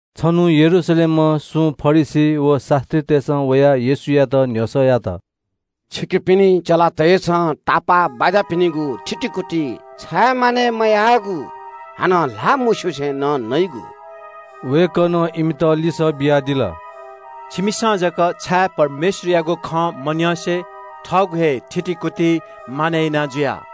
छन्‍हु यरूशलेमं सुं फरिसी व शास्‍त्रीतय्‌सं वयाः येशूयात न्‍ह्यसः यात – “छिकपिनि चेलातय्‌सं तापाःबाज्‍यापिनिगु थितिकुति छाय् मानय् मयाःगु? हानं ल्‍हाः मस्‍युसे नं नइगु?” वय्‌कलं इमित लिसः बियादिल – “छिमिसं जक छाय् परमेश्‍वरयागु खँ मन्‍यंसे थःगु हे थितिकुति मानय् याना जुया?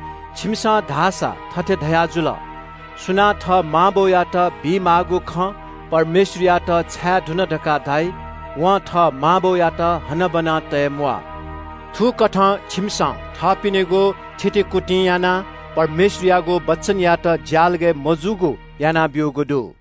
छिमिसं धाःसा थथे धयाजुल – ‘सुनां थः मां बौयात बीमाःगु खँ परमेश्‍वरयात छाये धुन धकाः धाइ, वं थः मां बौयात हनाबना तये म्‍वाः।’ थुकथं छिमिसं थःपिनिगु थितिकुतिं यानाः परमेश्‍वरयागु वचनयात ज्‍यालगय् मजूगु यानाब्‍यूगु दु।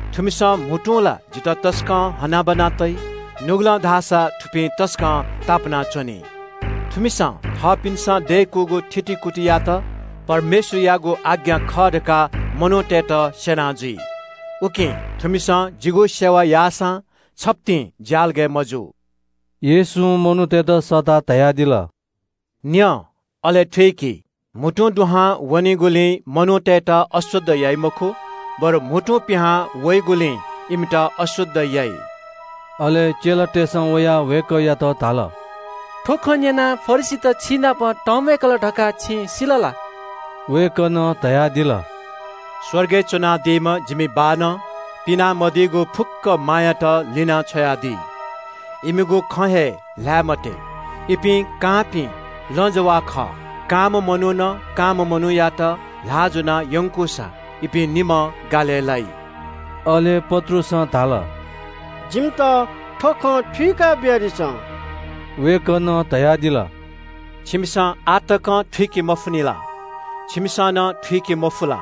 “‘थुमिसं म्‍हुतुं ला जितः तसकं हनाबना तइ। नुगलं धाःसा थुपिं तसकं तापाना च्‍वनी। थुमिसं थःपिन्‍सं दय्‌कूगु थितिकुतियात परमेश्‍वरयागु आज्ञा खः धकाः मनूतय्‌त स्‍यना जुइ। उकिं थुमिसं जिगु सेवा याःसां छप्‍तिं ज्‍यालगय् मजू।’” येशूं मनूतय्‌त सःताः धयादिल – “न्‍यँ अले थुइकि। म्‍हुतुं दुहां वनीगुलिं मनूतय्‌त अशुद्ध याइ मखु, बरु म्‍हुतुं पिहां वइगुलिं इमित अशुद्ध याइ।” अले चेलातय्‌सं वयाः वय्‌कःयात धाल – “थ्‍व खँ न्‍यनाः फरिसीत छिनाप तंम्‍वय्‌कल धकाः छिं सिल ला?” वय्‌कलं धयादिल – “स्‍वर्गय् च्‍वनादीम्‍ह जिमि बाःनं पिना मदीगु फुक्‍क मायात लिनाछ्वयादी। इमित त्‍वःताछ्व। इपिं कांपिं लँजवाः खः। कांम्‍ह मनुखं कांम्‍ह मनूयात ल्‍हाः ज्‍वनाः यंकूसा इपिं निम्‍हं गालय् लाइ।” अले पत्रुसं धाल – “जिमित थ्‍व खँ थुइका बियादिसँ।” वय्‌कलं धयादिल – “छिमिसं आः तकं थुइके मफुनि ला? छिमिसं नं थुइके मफु ला?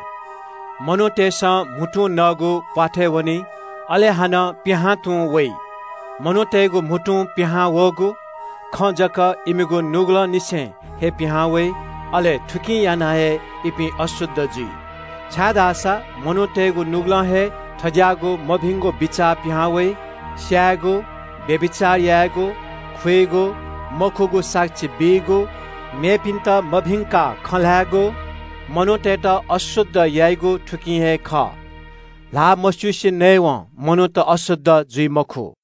मनूतय्‌सं म्‍हुतुं नःगु प्‍वाथय् वनी, अले हानं पिहां तुं वइ। मनूतय्‌गु म्‍हुतुं पिहां वःगु खँ धाःसा इमिगु नुगलंनिसें हे पिहां वइ। अले थुकिं यानाः हे इपिं अशुद्ध जुइ। छाय्‌धाःसा मनूतय्‌गु नुगलं हे थज्‍याःगु मभिंगु बिचाः पिहां वइ – स्‍यायेगु, व्‍यभिचार यायेगु, खुइगु, मखुगु साक्षी बीगु, मेपिन्‍त मभिंकाः खँ ल्‍हायेगु। मनूतय्‌त अशुद्ध याइगु थुकिं हे खः। ल्‍हाः मस्‍युसे नयेवं मनूत अशुद्ध जुइ मखु।”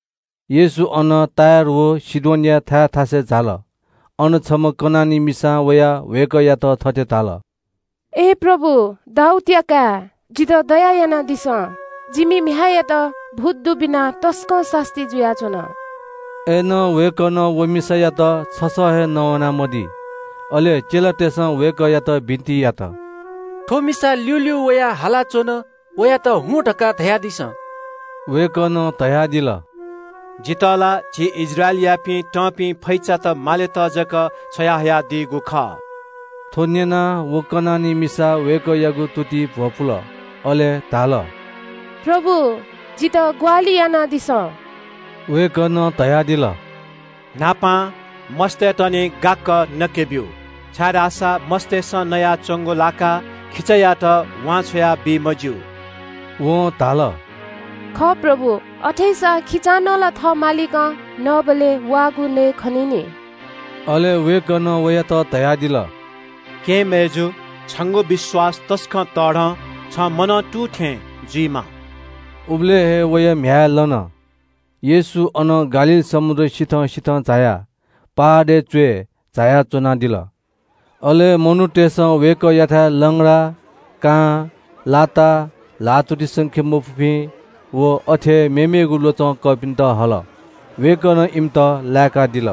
येशू अनं टुरोस व सीदोनया थाय् थासय् झाल। अन छम्‍ह कनानी मिसां वयाः वय्‌कःयात थथे धाल – “प्रभु, दाऊदया काय्, जितः दया यानादिसँ। जिमि म्‍ह्याय्‌यात भूत दुबिनाः तसकं सास्‍ती जुयाच्‍वन।” अय्‌नं वय्‌कलं व मिसायात छसः हे नवाना मदी। अले चेलातय्‌सं वय्‌कःयात बिन्‍ति यात – “थ्‍व मिसा ल्‍यूल्‍यू वयाः हालाच्‍वन, वयात ‘हुँ’ धकाः धयादिसँ।” वय्‌कलं धयादिल – “जितः ला झी इस्राएलयापिं तंपिं फैचात मालेत जक छ्वयाहयादीगु खः।” थ्‍व न्‍यनाः व मिसा वय्‌कःयागु तुतिइ भ्‍वपुल। अले धाल – “प्रभु, जितः ग्‍वाहालि यानादिसँ।” वय्‌कलं धयादिल – “न्‍हापां मस्‍तय्‌त निं गाक्‍क नके ब्‍यु, छाय्‌धाःसा मस्‍तय्‌सं नयाच्‍वंगु लाकाः खिचायात वान्‍छ्वया बी मज्‍यू।” वं धाल – “खः प्रभु, अथेसां खिचां नं ला थः मालिकं नःबलय् वाःगु नयेखनी नि।” अले वय्‌कलं वयात धयादिल – “केहेँ मय्‌जु, छिगु विश्‍वास तसकं तःधं, छिं मनं तुं थें जुइमा।” उबलय् हे वया म्‍ह्याय् लन। येशू अनं गालील समुद्र सिथं सिथं झायाः पहाडय् च्‍वय् झायाः च्‍वनादिल। अले मनूतय्‌सं वय्‌कःयाथाय् लंग्रा, कां, लाता, ल्‍हाःतुति संके मफुपिं व अथे हे मेमेगु ल्‍वचं कःपिन्‍त हल। वय्‌कलं इमित लाय्‌कादिल।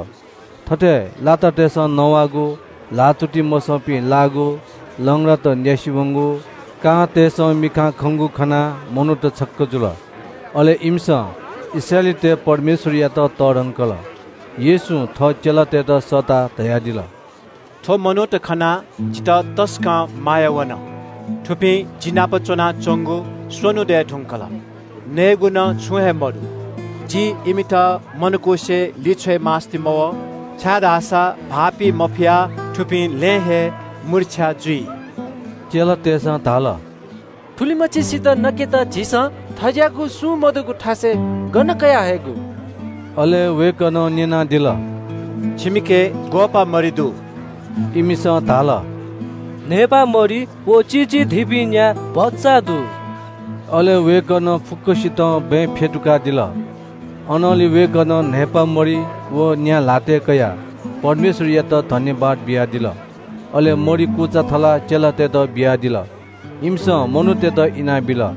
थथे लातातय्‌सं नवाःगु, ल्‍हाःतुति मसंपिं लाःगु, लंग्रात न्‍यासि वंगु, कांतय्‌सं मिखां खंगु खनाः मनूत छक्‍क जुल। अले इमिसं इस्राएलीतय् परमेश्‍वरयात तःधंकल। येशूं थः चेलातय्‌त सःताः धयादिल – “थ्‍व मनूत खनाः जितः तसकं माया वन। थुपिं जि नाप च्‍वनाच्‍वंगु स्‍वन्‍हु दये धुंकल। नयेगु नं छुं हे मदु। जिं इमित मनकुसे लिछ्वय् मास्‍ति मवः, छाय्‌धाःसा भाःपी मफयाः थुपिं लँय् हे मूर्छा जुइ।” चेलातय्‌सं धाल – “थुलिमछिसित नकेत झीसं थज्‍याःगु सुं मदुगु थासय् गन कयाः हयेगु?” अले वय्‌कलं न्‍यनादिल – “छिमिके ग्‍वःपाः मरि दु?” इमिसं धाल – “न्‍हय्‌पाः मरि व चिचिधिपिं न्‍या भचा दु।” अले वय्‌कलं फुक्‍कसितं बँय् फ्‍यतुकादिल। अनंलि वय्‌कलं न्‍हय्‌पा मरि व न्‍या ल्‍हातय् कयाः परमेश्‍वरयात सुभाय् बियादिल। अले मरि कुचा थलाः चेलातय्‌त बियादिल। इमिसं मनूतय्‌त इनाबिल।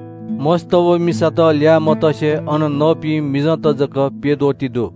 मस्‍त व मिसात ल्‍याः मतसे अन नःपिं मिजंत जक प्‍यद्वः ति दु।